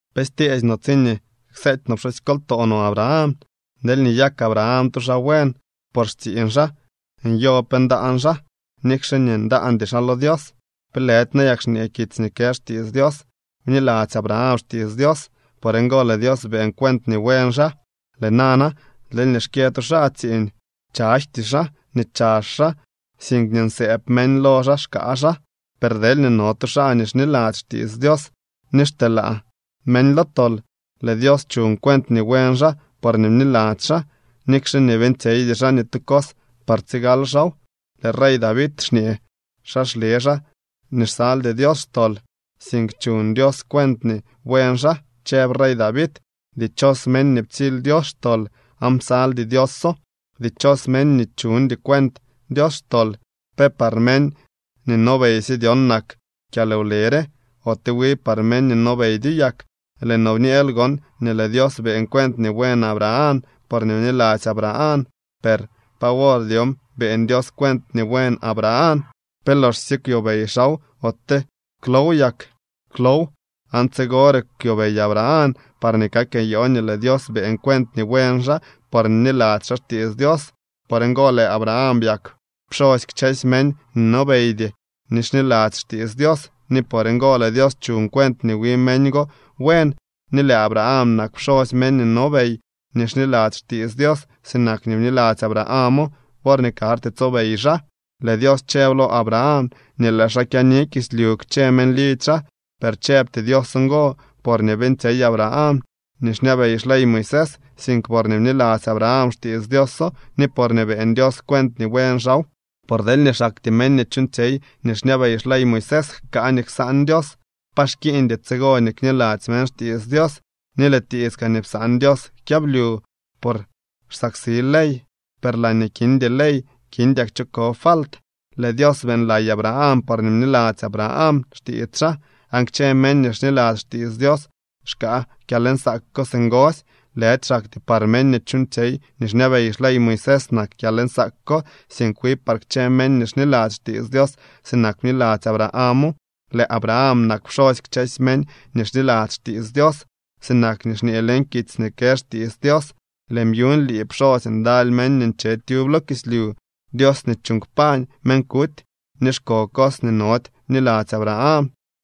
¿Pe styeesy no tsiñee kseety no pxusykoltoo no Abraham? Deelñee nyak Abraham tu xaa buen por xtsiiñ xaa, nyo pe ndaan xaa, nikxe nii ndaandy xaa lo Dios. ¿Pe lëdy nayak xñee kitsy nii kë xtiits Dios: “Bniladzy Abraham xtiits Dios, por ngo lëë Dios beeñ cuent nii buen xaa”? Lëë nana, deelñee xkyë tu xaa tsiiñ, chayjty xaa nii chazh xaa, sink nii nsëëb meñ lo xaa xkaa xaa. Per deelñee no tu xaa nii xniladzy xtiits Dios nii xteelaa meñ lo tol, lëë Dios chuñ cuent nii buen xaa porñee bniladzy xaa, nikxe nii beeñtsyeydy xaa ni tu cos par tsigal xaaw. Lëë rey David xñee xa xle xaa nii xsaldy Dios xtol, sink chuñ Dios cuent nii buen xaa. Chëb rey David: Dichos meñ nii ptsily Dios xtol aan psaldy Dioso. Dichos meñ nii chuñdy cuent Dios xtol. ¿Pe par meñ nii nobeysye dyon nak kyalwle re, ote wi par meñ nii nobeydyo yak? Lëë noo bñeel gon nii lëë Dios beeñ cuent nii buen Abraham porñee bniladzy Abraham. Per ¿pa wor dyon beeñ Dios cuent nii buen Abraham? ¿Pe loxsye kwyobey xaaw, ote klow yak? Klow. Aan tsigore kwyobey Abraham parñee kak nyoo nii lëë Dios beeñ cuent nii buen xaa porñee bniladzy xaa xtiits Dios. Por ngo lëë Abraham byak pxosy kchësy meñ nii nobeydy nii xniladzy xtiits Dios, ni por ngo lëë Dios chuñ cuent nii wi meñ go buen. Ni lëë Abraham nak pxosy meñ nii nobey nii xniladzy xtiits Dios sinak nii bniladzy Abrahamo worñee karty tsobey xaa. Lëë Dios chëb lo Abraham nii lëë xaa kyaani kislyu kchë meñ lidzy xaa. Per chëbty Dios ngo porñee beeñtsyey Abraham nii xñabey xley Moisés, sink porñee bniladzy Abraham xtiits Dioso ni porñee beeñ Dios cuent nii buen xaaw. Por deelñee xaktyee meñ nii chuuñtsyey nii xñabey xley Moisés jkaa nii ksaan Dios, pa xkiiñdy tsigo nii kniladzy meñ xtiits Dios, ni lëë tiits kaa nii psaan Dios kyablyu. Por xsaksi ley, per laañee kindy ley, kindyak cho ko falt. Lëë Dios beeñlay Abraham porñee bniladzy Abraham xtiits xaa, aan kchë meñ nii xniladzy xtiits Dios xkaa kyalnsaak ko singosy. Lëdy xaktyee par meñ nii chuuñtsyey nii xñabey xley Moisés nak kyalnsaak ko, sink wi par kchë meñ nii xniladzy xtiits Dios sinak bniladzy Abrahamo. Lëë Abraham nak pxosy kchësy meñ nii xniladzy xtiits Dios, sinak nii xñee leñ kitsy nii kë xtiits Dios: “Lëën byuñ lii pxosy ndaly meñ nii nche tyub lo kislyu.” Dios nii chuuñ kpañ meñ kuty ni xko cos nii nody bniladzy Abraham.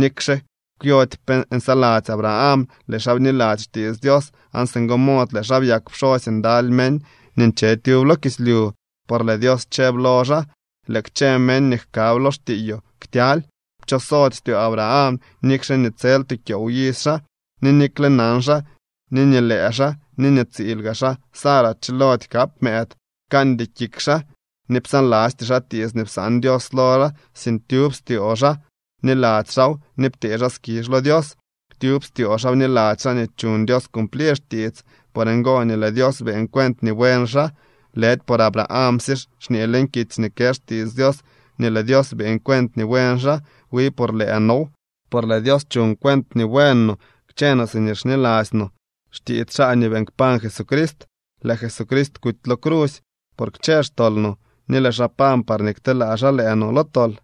Nikxe kwyody pe nsaladzy Abraham, lëë xaa bniladzy xtiits Dios, aan singo mod lëë xaa byak pxosy ndaly meñ nii nche tyub lo kislyu. Por lëë Dios chëb lo xaa: “Lëë kchë meñ nii jkab lo xtiiyoo ktyaly.” Pchosody styoo Abraham, nikxe nii tsel tu kyoow iz xaa, ni nikle nan xaa ni nii lëë xaa ni nii tsiil gaa xaa Sara chilody kap mëëd. Pkandy kik xaa ni psaanlasty xaa tiits nii psaan Dios lo xaa, sink tyub styoo xaa bniladzy xaaw ni ptee xaa skizh lo Dios. Tyub styoo xaa bniladzy xaa nii chuñ Dios cumplir xtiits. Por ngo nii lëë Dios beeñ cuent nii buen xaa. Lëdy por Abrahamsye xñee leñ kitsy nii kë xtiits Dios nii lëë Dios beeñ cuent nii buen xaa. Wi por lëë now. Por lëë Dios chuñ cuent nii buen no kchë no siñee xniladzy no xtiits xaa nii beeñ kpañ Jesucrist. Lëë Jesucrist kuty lo crusy por kchë xtol no, ni lëë xaa pañ parñee kteelaa xaa lëë no lo tol.